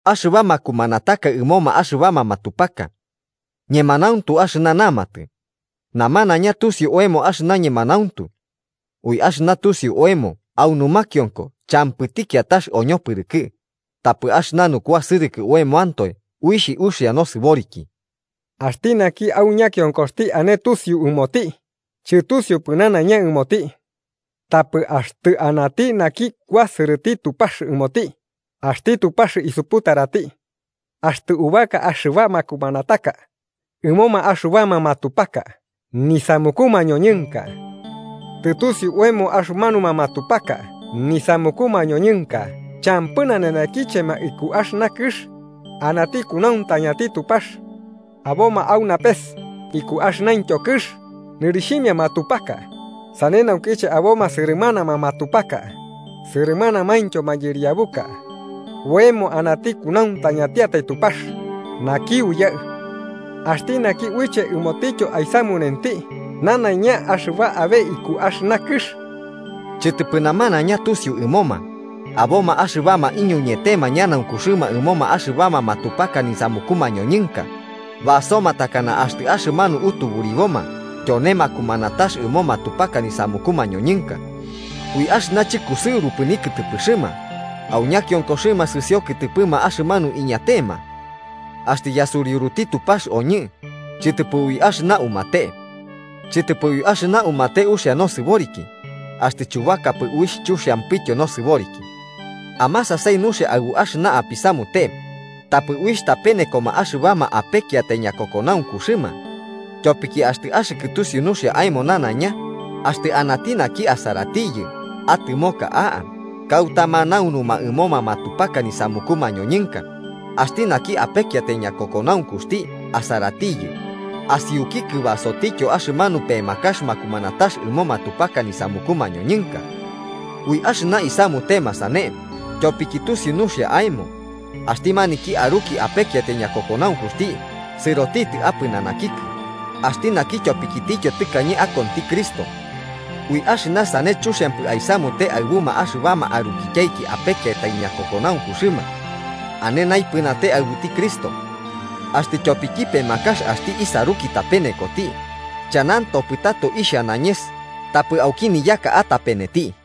Axɨba makumanataka ɨmoma axɨbama matupaka. Ñemanauntu axɨna namatɨ: namanaiña tusiu oemo axɨna ñemanauntu. Ui axɨna tusiu oemo au numakionko champɨti kiatax oñopɨrɨkɨ, tapɨ axɨna nukuasɨrɨkɨ oemoantoe uixh uxia nosɨboriki. Axti naki au ñakionkoxti ane tusiu ɨmoti, chɨtusiupɨ nanaiña ɨmoti. Tapɨ axtɨ anati naki kuasɨrɨti Tupax ɨmoti, axti Tupax isuputarati. Axtɨ ubaka axɨba makumanataka ɨmoma axɨbama matupaka nisamuku mañoñɨnka, tɨtusiu oemo axɨmanuma matupaka nisamuku mañoñɨnka champɨ nanenekichema iku axɨna kɨx, anati kunauntañati Tupax. Aboma au napes iku axɨnaintyo kɨx nɨrixhimia matupaka (sane naukiche aboma sɨrɨmanama matupaka sɨrɨmanamaintyo mayɨriabuka), oemo anati kunauntañatiatai Tupax, naki Uyaɨ. Axti naki uiche ɨmotityo aisamunenti nanaiña axɨba abe iku axɨna kɨx. Chɨtɨpɨ namanaiña tusiu ɨmoma, aboma axɨbama iñuñetema ñanaunkuxɨma ɨmoma axɨbama matupaka nisamuku mañoñɨnka, basoma takana axtɨ axɨmanu utuburiboma tyone makumanatax ɨmo matupaka nisamuku mañoñɨnka. Ui axɨna chɨkusɨurupɨ nikɨtɨpɨxɨma, au ñakionkoxɨma sɨsio kɨtɨpɨma axɨmanu iñatema. Axtɨ yasuriuruti Tupax oñɨ, chɨtɨpɨ ui axɨna umate. Chɨtɨpɨ ui axɨna umate uxia nosɨboriki, axtɨ chubakapɨ uixh chuxiampityo nosɨboriki. Amasasai nuxia aɨbu axɨna apisamute tapɨ uixh tapenekoma axɨbama apekiatai ñakokonaunkuxɨma. Tyopiki axtɨ axɨkɨ tusiu nuxia aemo nanaiña, axtɨ anati naki asaratiyɨ atɨmoka a'a kauta manaunuma ɨmoma matupaka nisamuku mañoñɨnka, axti naki apekiatai ñakokonaunkuxti asaratiyɨ, asiukikɨ basotityo axɨmanu pemakax makumanatax ɨmo matupaka nisamuku mañoñɨnka. Ui axɨna aisamute sane, tyopiki tusiu nuxia aemo, axti maniki aruki apekiatai ñakokonaunkuxti sɨrotitɨ apɨnanakikɨ, axti naki tyopikitityo tɨkañe akonti Cristo. Ui axɨna sane chuxiampɨ aisamute aɨbuma axɨbama arukityaiki apekiatai ñakokonaunkuxɨma, ane naipɨnate aɨbuti Cristo. Axtɨ tyopiki pemakax axti isaruki tapenekoti, chanantopɨ tato ixha nañes, tapɨ auki niyaka atapeneti.